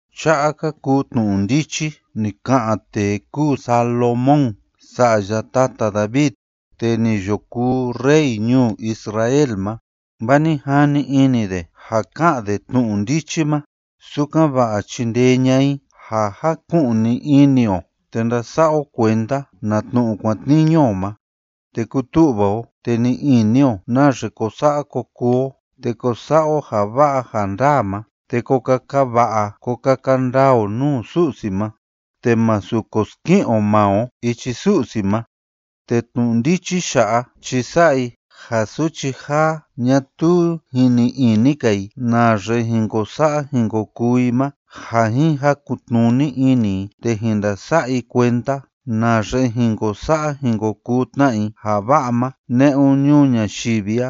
Cha'a ka kuu tnu'u ndichi ni ka'an tee kúu Salomón, sa'ya tata David, tee ni yo kuu rey ñuu Israel ma. Vaa ni jani ini de ja ka'an de tnu'u ndichi ma, sukan‑va'a chindee ña'a i ja jaku'ni ini o te ndasa'a o kuenda na tnu'u kuatniñu o ma, te kutu'va o, te ni'i ini o naxe ko sa'a ko kuu o, te ko sa'a o ja va'a ja ndaa ma, te ko kaka va'a ko kaka ndaa o nuu Su'si ma; te másu ko ski'in o maa o ichi Su'si ma. Te tnu'u ndichi ya'a chi sa'a i ja suchi jaa ñatuu jin ni'i ini‑ka i naxe jin ko sa'a jin ko kuu i ma ja jin jakun‑tnuni ini i, te jin ndasa'a i kuenda naxe jin ko sa'a jin ko kuu tna i ja va'a ma ne'un ñuu ñayivi a.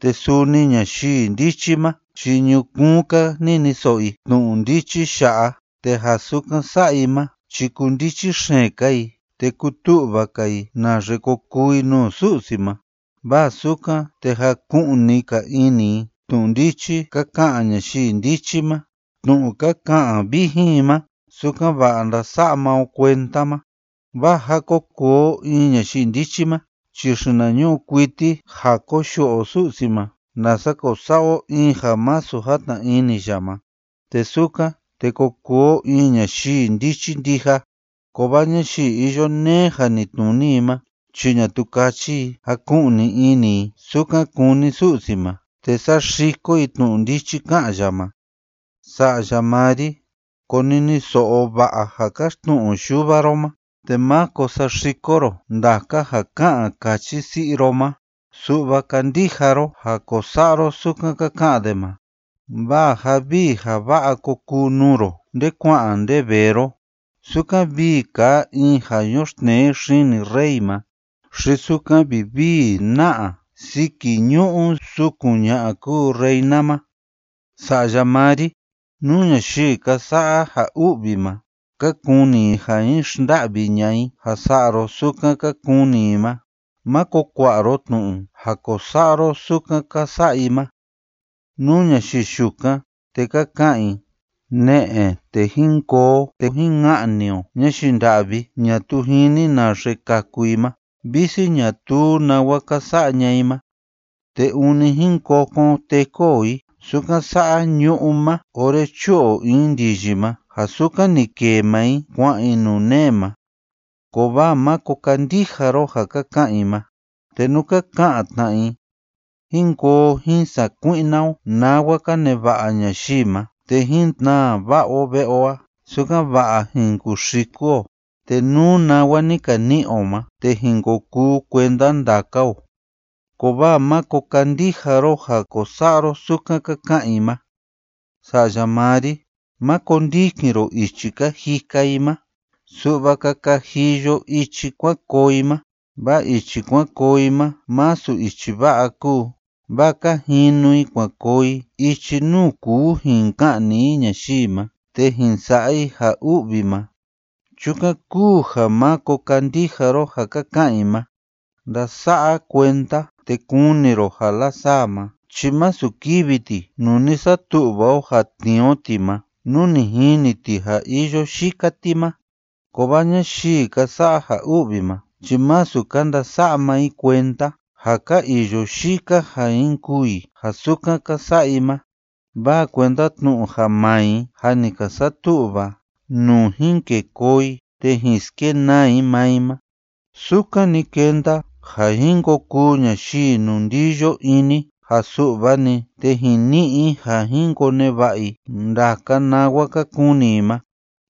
Te suni ñayii ndichi ma chi ñukuun‑ka niniso'o i tnu'u ndichi ya'a, te ja sukan sa'a i ma chi kundichi xeen‑ka i te kutu'va‑ka i naxe ko kuu i nuu Su'si ma, vaa sukan, te jaku'ni‑ka ini i tnu'u ndichi ka ka'an ñayii ndichi ma tnu'u ka ka'an vijin i ma sukan‑va'a ndasa'a maa o kuenda ma. Vaa ja ko kuu o in ñayii ndichi ma chi xinañu'u kuiti ja koyu'u o Su'si ma, nasa ko sa'a o in ja masu jatna ini ya ma, te sukan, te ko kuu o in ñayii ndichi ndija, kovaa ñayii iyo neé janitnuni i ma chi ñatuu káchi i jaku'ni ini i sukan kúni Su'si ma, te saxiko i tnu'u ndichi ká'an ya ma. Sa'ya maa ri, koniniso'o va'a ja káxtnu'u yuva ro ma, te máko saxiko ro ndaka ja ká'an káchi si'i ro ma; su'va kandija ro ja ko sa'a ro sukan ka ka'an de ma. Vaa ja vii ja va'a ko kuu nuu ro nde kua'an nde vee ro, sukan vii kaa in ja yoxtnee xini rey ma, xi sukan vivii na'a siki ñu'u sukun ña'a kuu reina ma. Sa'ya maa ri, nú ñayii ka sa'a ja u'vi ma, ka kuni i ja jin xnda'vi ña'a i ja sa'a ro sukan ka kuni i ma, ¡máko kua'a ro tnu'u ja ko sa'a ro sukan ka sa'a i ma! Nú ñayii yukan, te ka ka'an i: “Ne'e, te jín koo o te jín ka'ni o ñayii nda'vi ñatuu jini naxe kaku i ma; visi ñatuu nawa ka sa'a ña'a i ma. Te ûni jín kokon teku o i sukan sa'a ñu'ú ma ora chu'u o in ndiyi ma ja sukan ni kêe maa i kua'an i nuu nee ma”, kovaa máko kandija ro ja ka ka'an i ma. Te nú ka ka'an tna i: “Jín koo o jín sakui'na o nawa ka neva'a ñayii ma te jín tnaa va'a o ve'e o a, sukan‑va'a jin kuxiku o, te nú nawa ni ka ni'i o ma, te jin ko kuu kuenda ndaka o”, kovaa máko kandija ro ja ko sa'a ro sukan ka ka'an i ma. Sa'ya maa ri: ¡má kondikin ro ichi ka jika i ma!, su'va kaka jiyo ichi kuan koo i ma, vaa ichi kuan koo i ma masu ichi va'a kúu, vaa ka jinu i kuan koo i ichi nuu kuu jin ka'ni i ñayii ma te jin sa'a i ja u'vi ma. Chukan kúu ja, ¡máko kandija ro ja ka ka'an i ma! Ndasa'a kuenda, te kuni ro ja lasaa ma chi masu kivi ti nuu ni satu'va o ja tnii o ti ma nú ni jini ti ja iyo yika ti ma. Kovaa ñayii ka sa'a ja u'vi ma chi masu ka ndasa'a maa i kuenda ja ka iyo yika ja jin kûu i ja sukan ka sa'a i ma, vaa kuenda tnu'u ja maa i jâ ni ka satu'va nuu jin kê koo i te jin skenaa i maa i ma. Sukan‑ni kenda ja jin ko kuu ñayii inundiyo ini ja su'va‑ni te jin ni'i i ja jin koneva'a i ndaka nawa ka kuni i ma;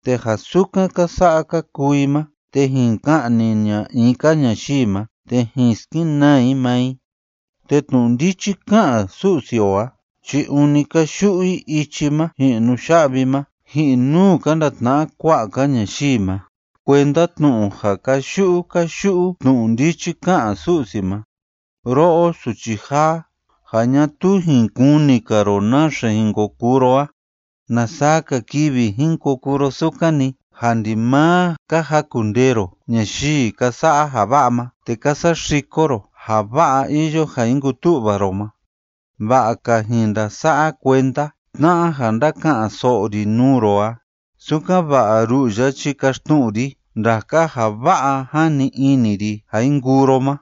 te ja sukan ka sa'a ka kuu i ma, te jin ka'ni ña'a in‑ka ñayii ma te jin skenaa i maa i. Te tnu'u ndichi ká'an Su'si o a chi ûni káyu'u i ichi ma ji'in nuya'vi ma. Ji'in nuu ka ndatna'a kua'a‑ka ñayii ma kuenda tnu'u ja káyu'u káyu'u tnu'u ndichi ká'an Su'si ma: “Ro'o suchi jaa, ja ñatuu jin kuni‑ka ro naxe jin ko kuu ro a, ¿na saa‑ka kivi jin ko kuu ro sukan‑ni, ja ndimaa ka jakundee ro ñayii ka sa'a ja va'a ma, te ka saxiko ro ja va'a iyo ja jin kutu'va ro ma? Va'a‑ka jin ndasa'a kuenda tna'a ja ndáka'an‑so'o ri nuu ro a, sukan‑va'a ru'u ya chi kaxtnu'u ri ndaka ja va'a jani ini ri ja jin kuu ro ma.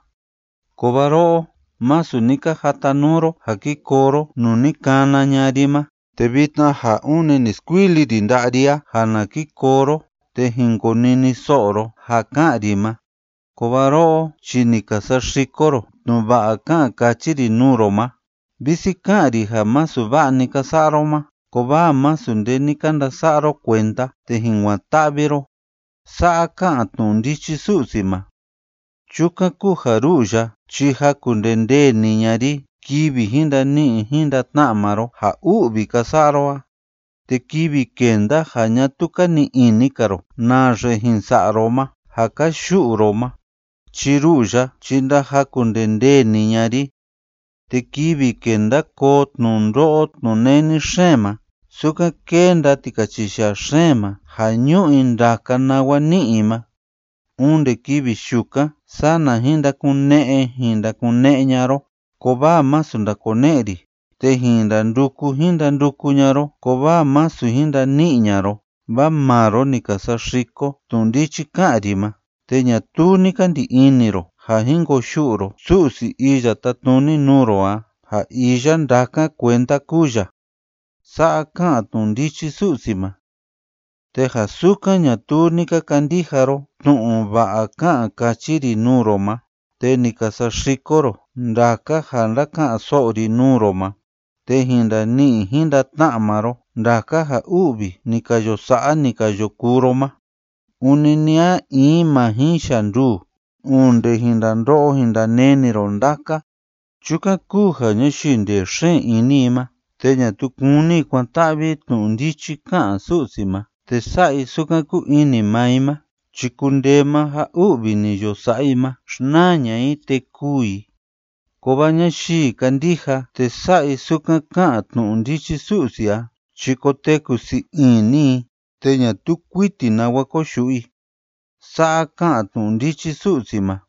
Kovaa ro'o, masu ni ka jatanuu ro ja ki koo ro nuu ni kana ña'a ri ma, te vitna ja ûni ni skuili ri nda'a ri a ja na ki koo ro te jin koniniso'o ro ja ká'an ri ma, kovaa ro'o chi ni ka saxiko ro tnu'u va'a ká'an káchi ri nuu ro ma. Visi ká'an ri ja masu va'a‑ni ka sa'a ro ma, kovaa masu nde ni ka ndasa'a ro kuenda te jin kuan‑ta'vi ro.” Sa'a ká'an tnu'u ndichi Su'si ma. “Chukan kúu ja ru'u ya chi jakundendee‑ni ña'a ri kivi jin ndani'i jin ndatna'a maa ro ja u'vi ka sa'a ro a. Te kivi kenda ja ñatuu ka ni'i ini‑ka ro naxe jin sa'a ro ma ja ka yu'u ro ma chi ru'u ya chi ndajakundendee‑ni ña'a ri. Te kivi kenda koo tnundo'o tnuneni xeen ma, sukan kénda tikachiyaa xeen ma ja ñú'u i ndaka nawa ní'i i ma, onde kivi yukan sana jin ndakune'e jin ndakune'e ña'a ro, kovaa masu ndakone'e ri; te jin ndanduku jin ndanduku ña'a ro, kovaa masu jin ndani'i ña'a ro. Vaa maa ro ni ka saxiko tnu'u ndichi ká'an ri ma te ñatuu ni ka ndi ini ro ja jin koyu'u ro Su'si Iya Tátnuni nuu ro a, ja iya ndákan kuenda kúu ya.” Sa'a ká'an tnu'u ndichi Su'si ma. “Te ja sukan ñatuu ni ka kandija ro tnu'u va'a ká'an káchi ri nuu ro ma te ni ka saxiko ro ndaka ja ndáka'an‑so'o ri nuu ro ma, te jin ndani'i jin ndatna'a maa ro ndaka ja u'vi ni ka yo sa'a, ni ka yo kuu ro ma. Ûni ni a in ma jin yanduu, onde jin ndando'o jin ndaneni ro ndaka. Chukan kúu ja ñayii ndee xeen ini i ma, te ñatuu kúni i kuan‑ta'vi i tnu'u ndichi ká'an Su'si ma te sa'a i sukan kúu ini maa i ma chi kundee maa ja u'vi ni yo sa'a i ma xnaa ña'a i te kûu i. Kovaa ñayii kándija te sa'a i sukan ká'an tnu'u ndichi Su'si a chi koteku sii ini i, te ñatuu kuiti nawa koyu'u i.” Sa'a ká'an tnu'u ndichi Su'si ma.